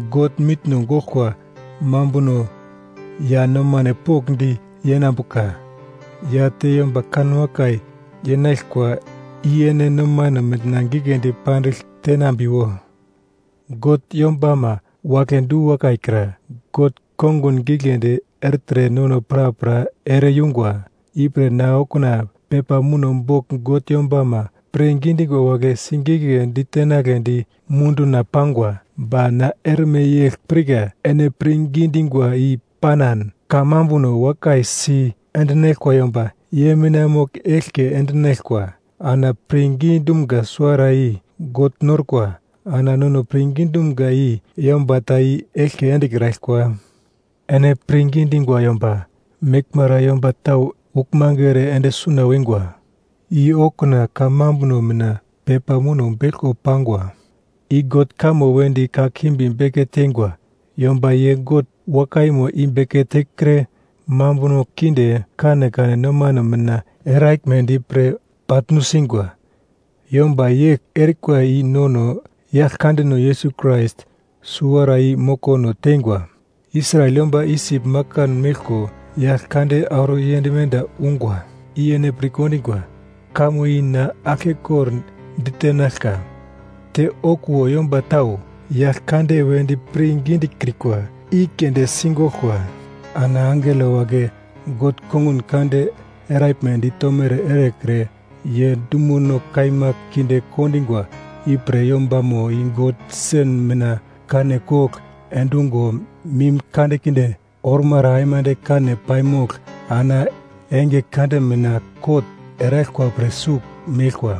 God, mitno goglkwa mambuno ya nomane pokndi yenambuka ya te yomba kanwakai yenaglkwa i ene nomane mina giglendi pandigl tenambiwo. God yombama wagle du-wakai kra, God kongun giglendi ertre nono prapra ere-yungwa. Ipre na okuna pepa muno bogl God yombama pirngi dingwa wagle sigigledi tenagledi munduna pangwa. Ba na erme yegl pirka, ene pirngi dingwa i panan, kamambuno wakai si endinaglkwa yomba, ye mina mogl eglke endinaglkwa. Ana pirngi dumga suwara i God norkwa ana nono pirngi dumga i yomba ta i eglke endekraglkwa. Ene pirngi dingwa yomba meglmara yomba tau uglmange ere ende suna wingwa. I okuna kamambuno mina pepa muno beglko pangwa. I God kamo wedi kakimbi beke teingwa yomba ye God wakaimo i beke tekre, mambuno kinde kanekane nomane mina eraglmedi pre bagl nusingwa. Yomba yegl erikwa i nono Yaglkandeno Yesus Krais suwara i mokono teingwa. Israel yomba Isip makan meglko Yaglkande auro yend menda ungwa i ene pir kendingwa, kamo i na aglke kordagl ditenaglka. Te okuwo yomba tau Yaglkande wedi pirngi dikrikwa i keunde si goglkwa. Ana angelo wagle, God kongun kande eraglmedi tomere erekre, ye dumono kaima kinde kondingwa ipre yombamo i God sen mina kane kogl endungo mim kandekinde ormara aimande kane paimogl ana enge kande mina kot eraglkwa pre sugl meglkwa.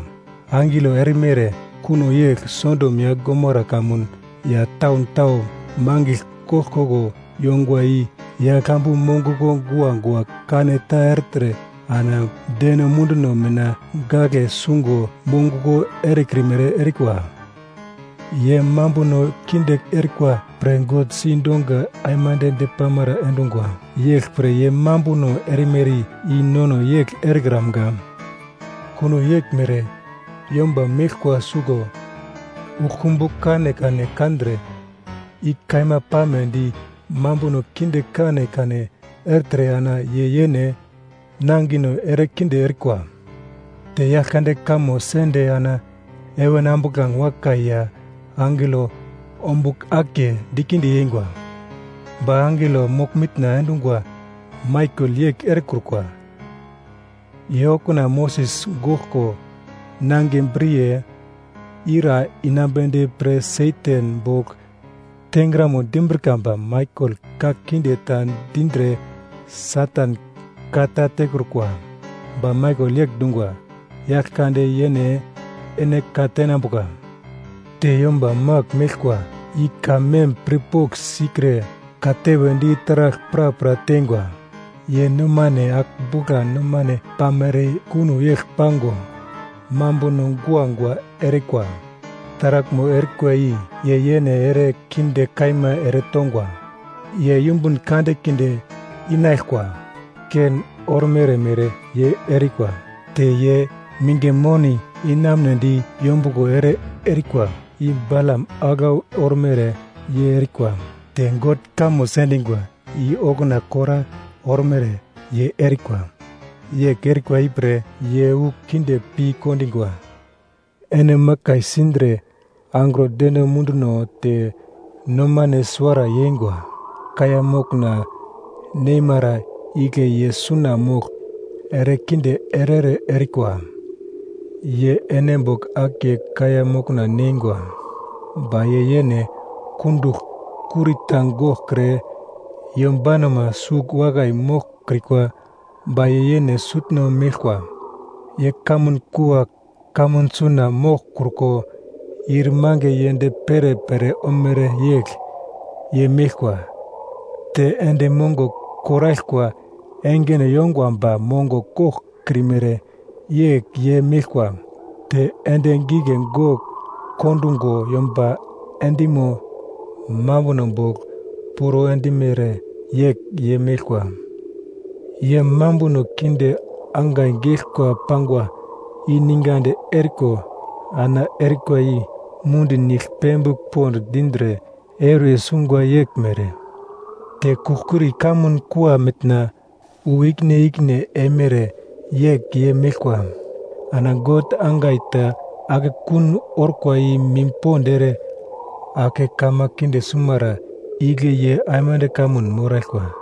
Angelo erimere kuno yegl. Sodom ya Gomara kamun ya taun tau mangigl koglkoglo yongwa i yaglambu monguglo guagua kane ta ertre ana deno munduno mina gagle sungo monguglo erekrimere erikwa. Ye mambuno kinde erikwa pre God si donga aimande depamara endungwa yeglpre ye mambuno erimere i nono yegl erekramga. Kuno yeglmere yomba meglkwa suglo uglkumbu kanekane kandre i kaima pamedi mambuno kinde kanekane ertre ana ye yene nangino ere kinde erikwa. Te Yaglkande kamo sende ana heven ambuglange wakai ya angelo ombugl akiye dikinde yengwa. Ba angelo mogl-mitna endungwa Maikel yegl erekrukwa. Ye okuna Moses goglko, nangiye briye ira inambedi pre Satan bogl tengramo dimbrika ba Maikel ka kinde ta dindre Satan ka ta tekrukwa. Ba Maikel yegl dungwa, “Yaglkande yene ene ka tenambuka.” Te yomba magl meglkwa i ka mem pirpogl sikre, katewe di taragl prapra tengwa. Ye nomane agl-bugla nomane pamere kuno yegl pango, mambuno guagua erikwa. Taraglmo erikwa i ye yene ere kinde kaima ere tongwa. Ye yumbun kandekinde inaglkwa! Kein ormere mere ye erikwa. Te ye minge moni inamunedi yombuglo ere erikwa i Balam aglau ormere ye erikwa. Te God kamo sendingwa i okuna Kora ormere ye erikwa. Yegl erikwa ipre ye wu kinde pi kondingwa. Ene makai sindre angro deno munduno te nomane suwara yeingwa, kaiya mokna neimara igle ye suna mogl erekinde ere-ere erikwa. Ye ene bogl akiye kaiya mokna neingwa, ba ye yene kundugl kurita goglkre yombanoma sugl wakai moglkrikwa ba ye yene sutno meglkwa, ye kamun kua kamun suna moglkruko, ir mange yend perepere omere yegl ye meglkwa. Te endi mongo koraglkwa engeno yongwa ba mongo koglkrimere yegl ye meglkwa, te endi gigle gogl kondungo yomba endimo mambuno bogl, puro endimere yegl ye meglkwa. Ye mambuno kinde angai geglkwa pangwa i ningadi eriko ana erikwa i mundi nigl pembigl pond dindre euriye sungwa yeglmere. Te kugl-kuri kamun kua mitna wu ikine ikine eimere yegl ye meglkwa. Ana God angai ta akekun orkwa i mim pond ere ake kama kinde sumara igle ye aimande kamun moraglkwa.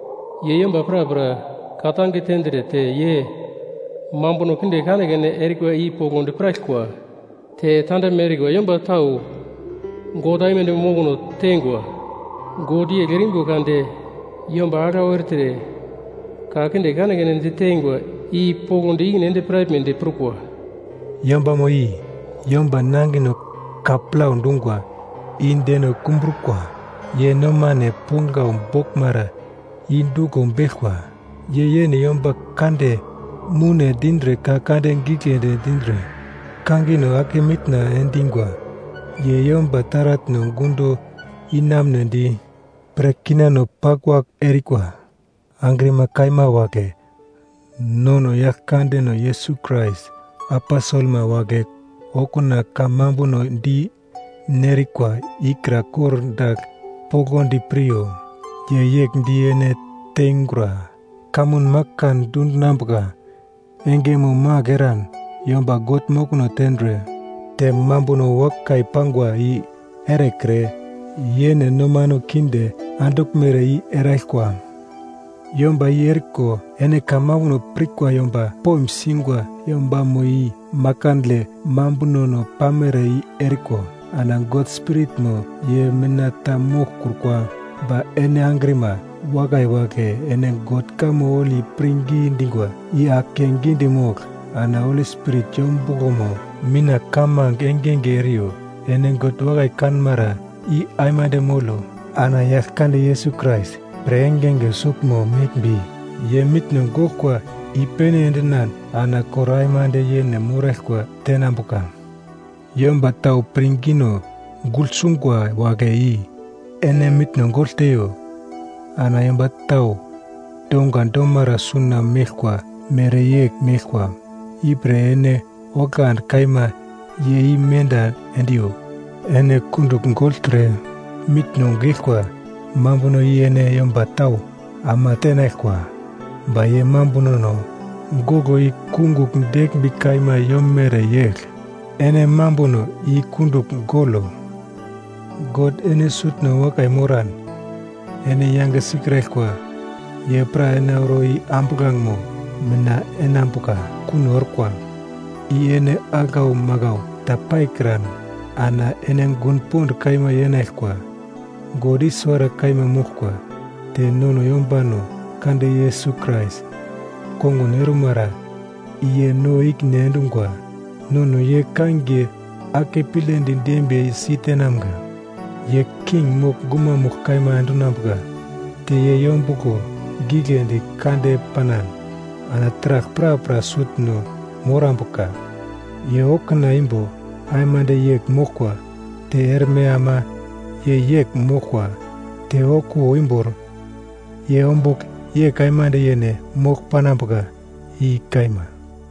ye yomba prapra ka-tange tendre te ye mambuno kinde kanekane erikwa i poglodi piraglkwa te tandaglme erikwa yomba tau God aimande mokono tengwa God yegl erimbo kade yomba aglau ertre ka kinde kanekane diteingwa i poglodi ikine ende piraglmedi prukwa.” Yombamo i yomba nangino ka plau dungwa i deno kumbrukwa. Ye nomane ponglau boglmara i duglo beglkwa. Ye yene yomba kande moune dindre ka kande giglendi dindre, kangino ake mitna endingwa. Ye yomba taratno gundo inamunedi pre kinano paglwagl erikwa. Angrima kaima wagle nono Yaglkandeno Yesus Krais aposelma wagle okuna kamambuno di nerikwa ikra kor dagl poglodi piryo. Ye yegl di ene teingura, kamun makan dundinambuka engemo magl eran, yomba God mokono tendre te mambuno wakai pangwa i erekre, yene nomane kinde anduglmere i eraglkwa. Yomba i eriko ene kamambuno pirkwa yomba poim singwa yombamo i makandle mambunono pamere i eriko, ana God Spiritmo ye mina ta moglkrukwa. Ba ene angrima wakai wagle ene God kamo holi pirngi dingwa i ake gidi mogl, ana Holi Spirit yombuglomo mina kamange engenge eriyo. Ene God wakai kanmara i aimande molo. Ana Yaglkande Yesus Krais pre engenge suglmo meglmbi, ye mitno goglkwa i-pene endinan ana kor aimande yene moraglkwa tenambuka. Yomba tau pirngino gugl sungwa wagle i ene mitno gogl teiyo. Ana yomba tau donga domara suna meglkwa mereyegl meglkwa. Ipre ene oglandi kaima ye i menda endiyo. Ene kundugl gogltre mitno geglkwa mambuno i ene yomba tau ama teinaglkwa ba ye mambunono goglo i kungugl deglmbi kaima yomere yegl. Ene mambuno i kundugl golo. God ene sutno wakai moran, ene yange sikraglkwa ye pra ene auro i ambuglangemo mina enambuka kuno orkwa. I ene aglau maglau ta paikran ana ene gun pond kaima yenaglkwa. God i suwara kaima moglkwa, te nono yombano kande Yesus Krais kongun ormara i ye no ikine endungwa. Nono ye kangiye akepledi dembiye si tenamga. Ye king mogl gumamugl kaima endinambuka te ye yombuglo gigledi kande panan ana taragl prapra sutno morambuka. Ye okuna imbo aimande yegl moglkwa, te erme ama ye yegl moglkwa. Te okuwo imbor ye ombugl yegl aimande yene mogl panambuka. I kaima.